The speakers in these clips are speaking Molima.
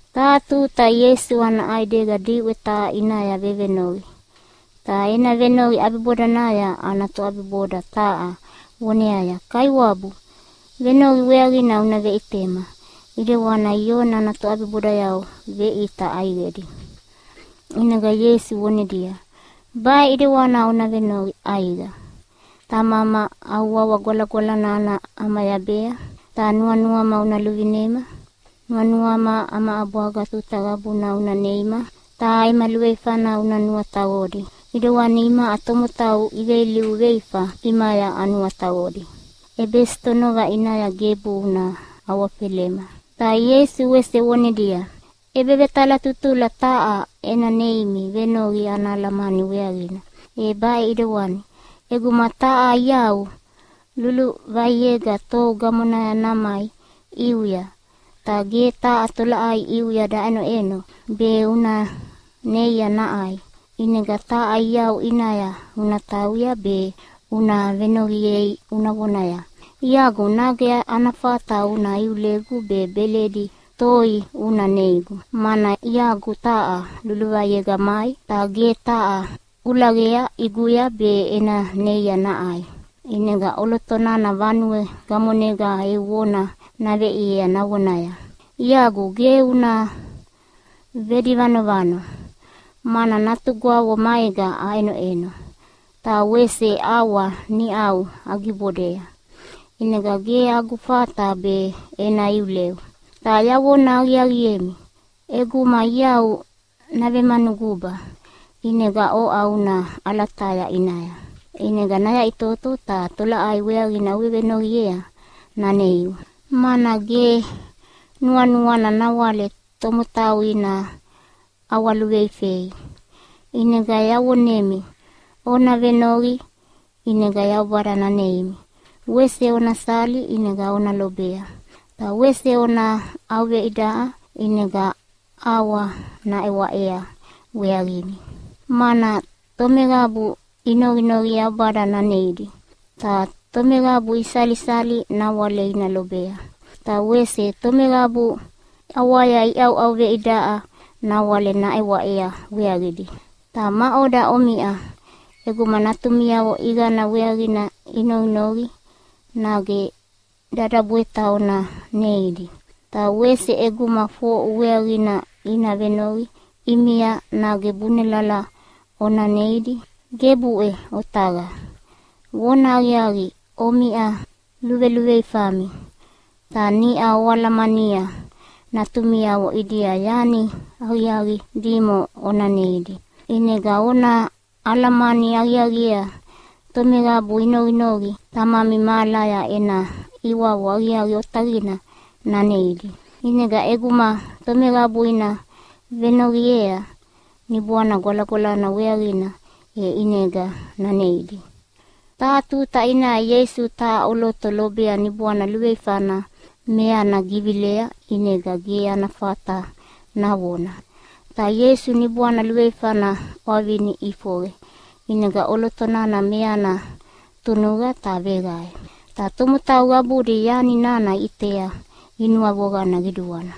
Taha tuta Ieisu ana ʼaidega diʼwe taha ʼinaya vevenoqi. Ta ena venoqi ʼabibodanaya ana toʼabiboda taha voneaya, “Kaiwabu, venoqi weaqina una veʼitema ʼedewana Ioni ana toʼabibodayavo veʼita ʼaiqedi.” ʼInega Ieisu vonedia, “Baʼe ʼedewana ona noqi ʼaiqa, ‘Tamama, au wawa gwalagwalana ana ʼamayabea, ta nuanuama una luvinema. Nuanuama ama ʼabwaga tuta qabuna una neima. Ta ema luveifana una nuataqodi ʼidewana imaʼa tomotau iveilivu veifa ʼimaya anuataqodi. ʼEbesitonova ʼinaya gebu una awafelema.’” Ta Ieisu wese vonedia, “ʼEbevetalatutula taha ena neimi venoqi ana alamani weaqina, e baʼe ʼedewani: ʼEguma taha iau luluvaiega tou gamonaya namai ʼiuya, ta ge taha tolaʼai ʼiuya daʼenoʼeno be una neia naʼai. ʼInega taha iau ʼinaya una tauya be una venoqiea una vonaya, ‘Iagu, nage ana fata una iulegu be beledi toi una neigu, mana iagu taha luluvaiega mai ta ge taha kulaqea ʼiguya be ena neia naʼai.’ “ʼInega ʼoloto nana vanue gamonega eu vona naveʼiea navonaya, ‘Iagu, ge una vedivanovano, mana natugwavo maega aʼenoʼeno ta wese ʼawa niʼau yagibodea, ʼinega ge agu fata be ena iuleu.’ Ta yavona aqiaqiemi, ʼeguma iau navemanuguba, ʼinega oʼa una ʼalataya ʼinaya, ʼinega nayaʼitoto ta tolaʼai weaqina uvevenoqiea naneiu, mana ge nuanuana nawale tomotau ina ʼawaluveifei. “ʼInega yavonemi, ona venoqi ʼinega Yaubada naneimi, wese ona sali ʼinega ona lobea, ta wese ona ʼauveidaʼa ʼinega ʼawa naʼewaʼea weaqimi. Mana tomeqabu inoqinoqi Yaubada naneidi, ta tomeqabu isalisali nawale ina lobea, ta wese tomeqabu ʼawaya iʼauʼauveidaʼa nawale naʼewaʼea weaqidi. “Ta maʼoda omiʼa, ʼeguma natumiavo ʼiqana weaqina inoqinoqi nage dadabweta ona neidi? Ta wese ʼeguma foʼu weaqina ina venoqi ʼimia nage bunelala ona neidi? Gebuʼe otaqa! Vonahaqiaqi, omiʼa luveluveifami, ta niʼa oalamania natumiavo ʼidia yani aqiaqi dimo ona neidi, ʼinega ona alamani aqiaqiea tomeqabu inoqinoqi Tamami mahalaya ena ʼiwavo aqiaqi otaqina naneidi. ʼInega ʼeguma tomeqabu ina venoqiea Niboana Gwalagwalana weaqina e ʼinega naneidi.” Taha tuta ʼinaya Ieisu taha ʼoloto lobea niboana luveifana meana givilea ʼinega ge ana fata navona. Ta Ieisu niboana luveifana ʼwavini ʼifoqe, ʼinega ʼoloto nana meana tunuqa ta veqae. Ta tomotau qabudi yani nana iʼitea inuavoqana qiduana.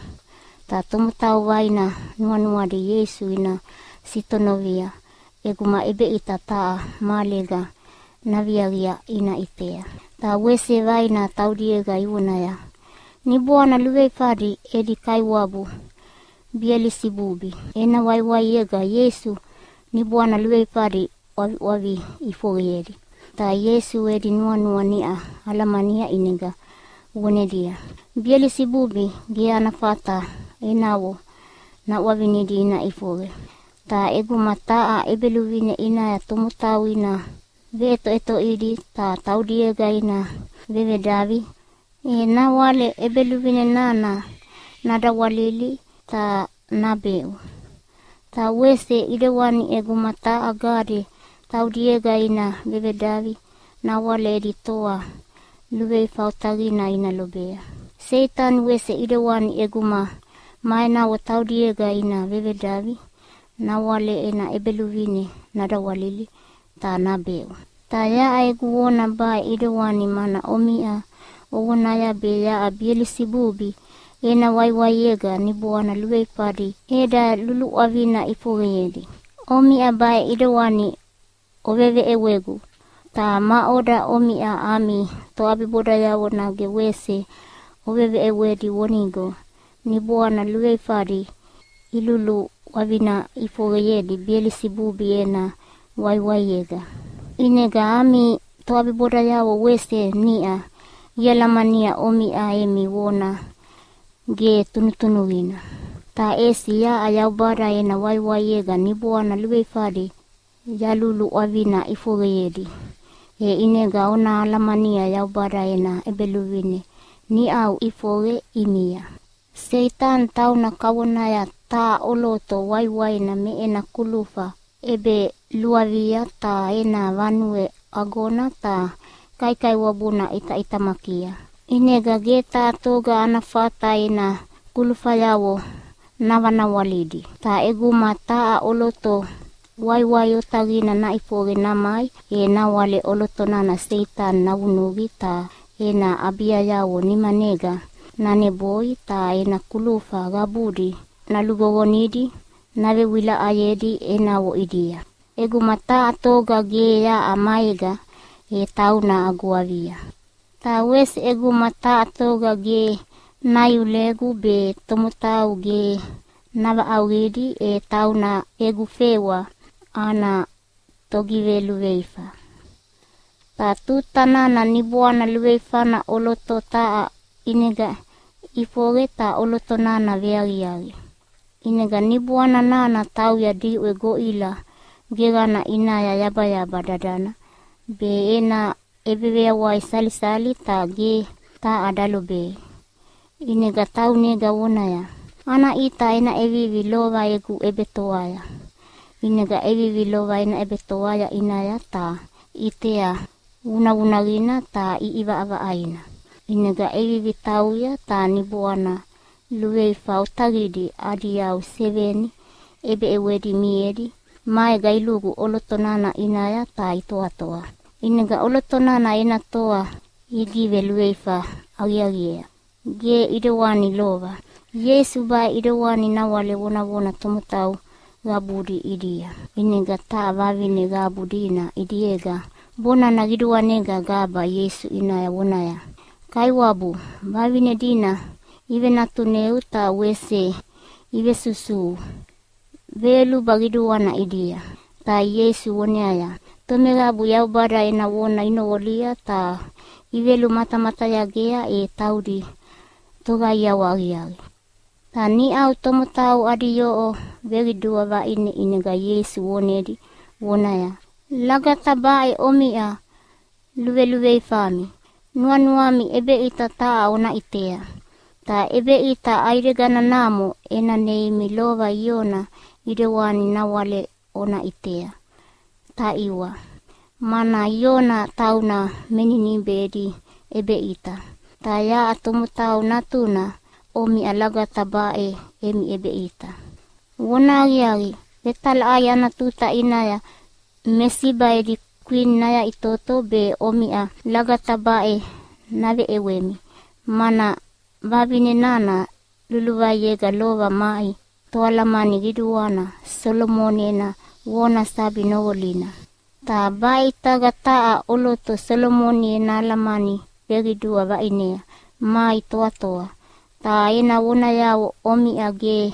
Ta tomotau vaina nuanuadi Ieisu ina sitonovia ʼeguma ʼebeʼita taha mahalega naviaqi ina ʼitea. Ta wese vaina taudiega ivonaya, “Niboana luveifadi edi kaiwabu Belisibubi ena waiwaiega Ieisu niboana luveifadi ʼwaviʼwavi ʼifoqeyedi.” Ta Ieisu edi nuanua niʼa alamania ʼinega vonedia, “Belisibubi ge ana fata enavo naʼwavinidi ina ʼifoqe. Ta ʼeguma taha ʼebeluvine ʼinaya tomotau ina veʼetoʼetoʼidi ta taudiega ina vevedavi, e nawale ʼebeluvine nana nadawalili ta nabeʼu. Ta wese ʼedewani ʼeguma taha gade taudiega ina vevedavi nawale edi toa luveifa otaqina ina lobea. Seitani wese ʼedewani ʼeguma ma enavo taudiega ina vevedavi, nawale ena ʼebeluvine nadawalili ta nabeʼu. Ta yaʼa egu vona baʼe ʼidewani mana omiʼa ovonaya be yaʼa Belisibubi ena waiwaiega niboana luveifadi eda luluʼwavina ʼifoqeyedi. Omiʼa baʼe ʼidewani oveveʼewegu, ta maʼoda omiʼa ami toʼabibodayavo nage wese oveveʼewedi vonigo niboana luveifadi iluluʼwavina ʼifoqeyedi Belisibubi ena waiwaiega? ʼInega ami toʼabibodayavo wese niʼa ialamania omiʼa emi vona ge tunutunuqina. Ta ʼesi yaʼa Yaubada ena waiwaiega niboana luveifadi yaluluʼwavina ʼifoqeyedi, e ʼinega ona alamania Yaubada ena ʼEbeluvine niʼau ʼifoqe ʼimia. “Seitani tauna kavonaya taha ʼoloto waiwaina me ena kulufa ʼebeluavia ta ena vanue agona ta kaikaiwabuna ʼitaʼitamakia, ʼinega ge taha toga ana fata ena kulufayavo navanawalidi. Ta ʼeguma taha ʼoloto waiwai otaqina naʼifoqe namai, e nawale ʼoloto nana Seitani navunuqi ta ena ʼabiayavo nimanega naneboi ta ena kulufa qabudi naluqoqonidi navewilaʼayedi enavo ʼidia. “ʼEguma taha toga ge yaʼa maega e tauna agu avia. Ta wese ʼeguma taha toga ge naiulegu be tomotau ge navaʼauqidi, e tauna egu fewa ana togiveluveifa.” “Ta tuta nana niboana luveifana ʼoloto taha ʼinega ʼifoqe ta ʼoloto nana veaqiaqi, ʼinega niboana nana tauya diʼwe goʼila geqana ʼinaya yabayaba dadana be ena ʼebeveyawai salisalia ta ge taha dalobei. ʼInega taunega vonaya, ‘Ana ʼita ena ʼevivi lova egu ʼebetoaya.’ ʼInega ʼevivi lova ena ʼebetoa ʼinaya ta ʼitea vunavunaqina ta ʼiʼivaʼavaʼaina. ʼInega ʼevivi tauya ta niboana luveifa otaqidi adi yau seveni ʼebeʼewedi miedi maega ilugu ʼoloto nana ʼinaya ta itoatoa. ʼInega ʼoloto nana ena toa igiveluveifa aqiaqiea, ge ʼedewani lova.” Ieisu baʼe ʼidewani nawale vonavona tomotau qabudi ʼidia, ʼinega taha vavine qabu dina ʼidiega bonana qiduanega gaba Ieisu ʼinaya vonaya, “Kaiwabu, vavine dina ivenatuneu ta wese ivesusuhu veyoluba qiduana ʼidia!” Ta Ieisu voneaya, “Tomeqabu Yaubada ena vona inoqolia ta ivelumatamatayagea, e taudi toqaiawa aqiaqi.” Ta niʼau tomotau adi yoʼo veqidua vaʼine ʼinega Ieisu vonedi vonaya, “Lagata baʼe omiʼa luveluveifami! Nuanuami ʼebeʼita taha ona ʼitea. Ta ʼebeʼita ʼaideganamo ena neimi lova Iona ʼidewani nawale ona ʼitea, taʼiwa! Mana Iona tauna me Ninibe edi ʼebeʼita, ta yaʼa Tomotau Natuna omiʼa lagata baʼe emi ʼebeʼita. Vonahaqiaqi, vetalaʼai ana tuta ʼinaya me Siba edi kwini nayaʼitoto be omiʼa lagata baʼe naveʼewemi, mana vavine nana luluvaiega lova mai toalamani qiduana Solomoni ena vona sabi noqolina. Ta baʼe ʼitaga taha ʼoloto Solomoni ena alamani veqidua vaʼinea mai toatoa, ta ena vonayavo omiʼa ge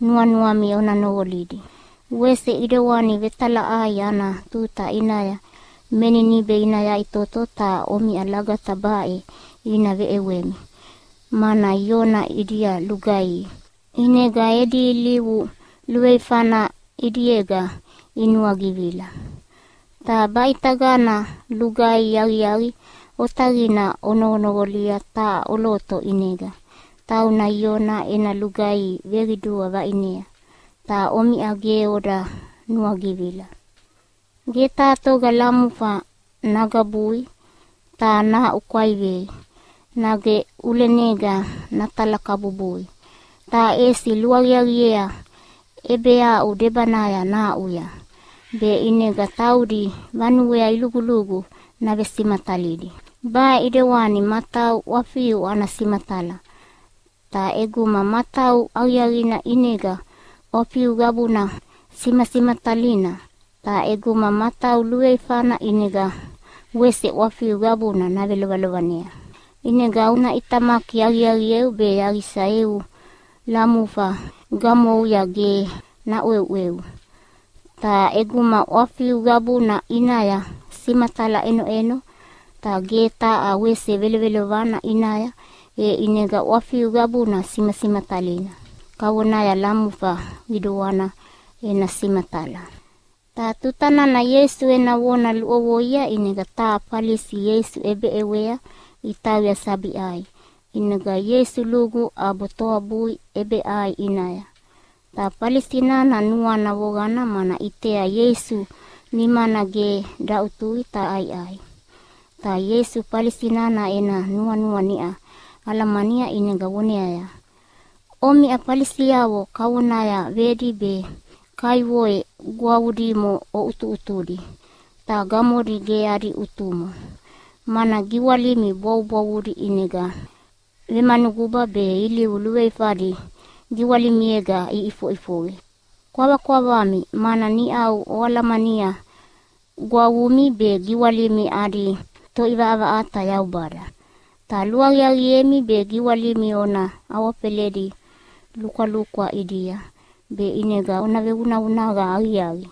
nuanuami ona noqolidi. “Wese ʼedewani vetalaʼai ana tuta ʼinaya me Ninibe ina yaʼitoto ta omiʼa lagata baʼe ina veʼewemi, mana Iona ʼidia lugaihi, ʼinega edi ilivu luveifana ʼidiega inuagivila. Ta baʼitagana lugaihi aqiaqi otaqina onoqonoqolia taha ʼoloto ʼinega, tauna Iona ena lugaihi veqidua vaʼinea, ta omiʼa ge oda nuagivila.” “Ge taha toga lamufa nagabui ta nahaʼukwaivei, nage ʼulenega natalakabubui, ta ʼesi luaqiaqiea ʼebeaʼu debanaya nahaʼuya, be ʼinega taudi vanuea ilugulugu navesimatalidi. Baʼe ʼidewani matau ʼwafiu ana simatala, ta ʼeguma matau aqiaqina ʼinega ʼwafiu qabuna simasimatalina. Ta ʼeguma matau luveifana ʼinega wese ʼwafiu qabuna navelovelovanea. ʼInega una ʼitamaki aqiaqieu be yaqisa eu lamufa gamouya ge naʼweuʼweu. ʼInega ʼeguma ʼwafiu qabuna ʼinaya simatala ʼenoʼeno ta ge taha wese velovelovana ʼinaya, e ʼinega ʼwafiu qabuna simasimatalina, kavonaya lamufa qiduana ena simatala.” Ta tuta nana Ieisu ena vona luʼovoia ʼinega taha Falisi Ieisu ʼebeʼewea itauya sabi ʼai. ʼInega Ieisu lugu ʼabo toabui ʼebeʼai ʼinaya. Ta Falisi nana nuana voqana mana ʼitea Ieisu nimana ge daʼutui ta ʼaiʼai. Ta Ieisu Falisi nana ena nuanua niʼa alamania ʼinega voneaya, “Omiʼa Falisiavo kavonaya vedi be kaivoe gwavu dimo ʼutuʼutudi ta gamodi ge adi ʼutumo, mana giwalimi bwavubwavudi ʼinega vemanuguba be ilivu luveifadi giwalimiega ʼifoʼifoqe. Kwavakwavami! Mana niʼau oalamania gwavumi be giwalimi adi Toʼivaʼavaʼata Yaubada. Ta luaqiaqiemi be giwalimi ona awafeledi lukwalukwa ʼidia be ʼinega ona vevunavunaqa aqiaqi.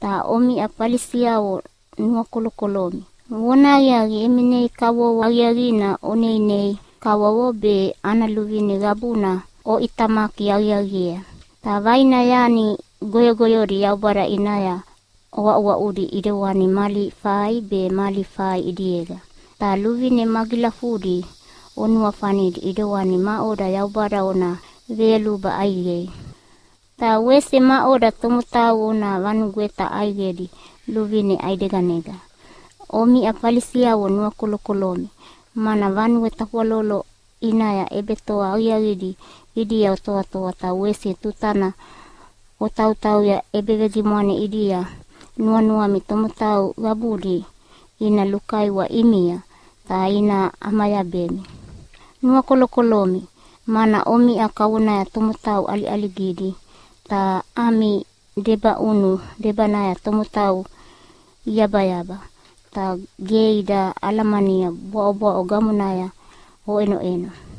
“Ta omiʼa Falisiavo nuakolokolomi! Vonahaqiaqi, emi nei kavovo aqiaqina oneinei kavovo be ana luvine qabuna oʼitamaki aqiaqiea. Ta vaina yani goyogoyodi Yaubada ʼinaya oaʼuaʼudi ʼedewani mali fai be mali fai ʼidiega. Ta luvine magilafudi onuafanidi ʼidewani maʼoda Yaubada ona veyoluba ʼaiqei, ta wese maʼoda tomotau ona vanugweta ʼaiqedi luvine ʼaideganega. “Omiʼa Falisiavo nuakolokolomi! Mana vanue tafwalolo ʼinaya ʼebetoa aqiaqidi ʼidia otoatoa, ta wese tutana otautauya ʼebegimwane ʼidia nuanuami tomotau qabudi ina lukaiwa ʼimia ta ina ʼamayabemi. Nuakolokolomi, mana omiʼa kavonaya tomotau ʼaliʼaligidi ta ami debaʼunu debanaya tomotau iyabayaba, ta ge ida alamania bwaʼobwaʼo gamonaya oʼenoʼeno.”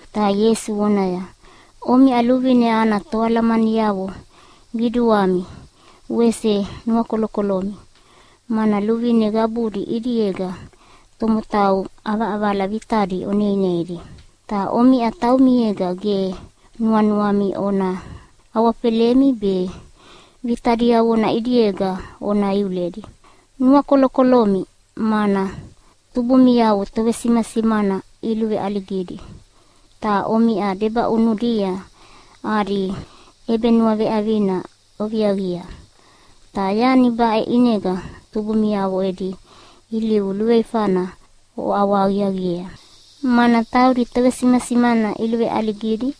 Ta Ieisu voneaya, “Omiʼa luvine ana toalamaniavo qiduami wese nuakolokolomi, mana luvine qabudi ʼidiega tomotau ʼavaʼavala vitadi oneineidi, ta omiʼa taumiega ge nuanuami ona awafelemi be vita diavona ʼidiega ona iuledi. Nuakolokolomi, mana tubumiavo tovesimasimana iluveʼaligidi, ta omiʼa debaʼunudia adi ʼebenuaveʼavina oviaqia. Ta yani baʼe ʼinega tubumiavo edi ilivu luveifana oʼawahaqiaqiea, mana taudi tovesimasimana iluveʼaligidi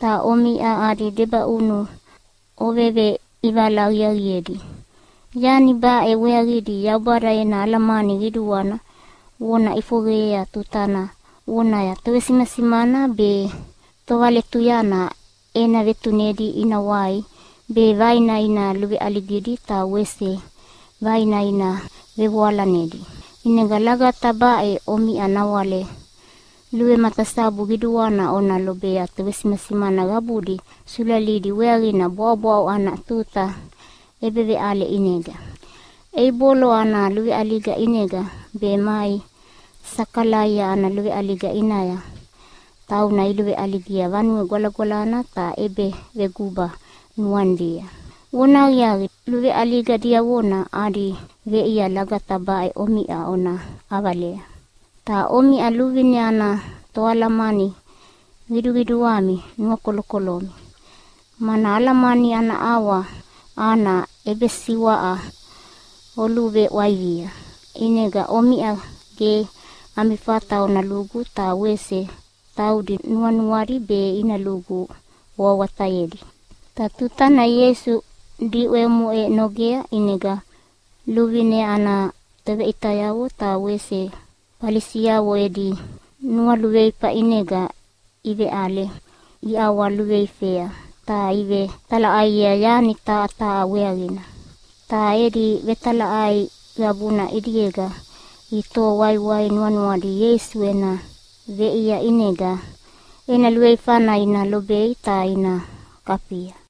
ta omiʼa adi debaʼunu oveveʼivala aqiaqiedi. Yani baʼe weaqidi Yaubada ena alamani qiduana vona ʼifoqeyea tutana vonaya, ‘Tovesimasimana be tovaletuyana ena vetunedi ina wai be vaina ina luveʼaligidi ta wese vaina ina vevoalanedi.’ “ʼInega lagata baʼe omiʼa nawale luvematasabu qiduana ona lobea tovesimasimana qabudi sulalidi weaqina bwaʼobwaʼo ana tuta ʼebeveʼale ʼinega. Eibolo ana luveʼaliga ʼinega be mai Sakalaia ana luveʼaliga ʼinaya, tauna iluveʼaligia Vanue Gwalagwalana ta ʼebeveguba nuanidia. Vonahaqiaqi, luveʼaliga diavona adi veʼia lagata baʼe omiʼa ona ʼavalea. “Ta omiʼa luvine ana toalamani qiduqiduami, nuakolokolomi! Mana alamani ana ʼawa ana ʼebesiwaʼa oluveʼwaivia. ʼInega omiʼa ge ami fata ona lugu, ta wese taudi nuanuadi be ina lugu oawatayedi.” Ta tutana Ieisu diʼwe omoʼe nogea, ʼinega luvine ana toveʼitayavo ta wese Falisiavo edi nualuveifa ʼinega iveʼale iʼawaluveifea ta ivetalaʼaiea yani taha taha weaqina. Ta edi vetalaʼai qabuna ʼidiega itoho waiwai nuanuadi Ieisu ena veʼia ʼinega ena luveifana ina lobei ta ina kafia.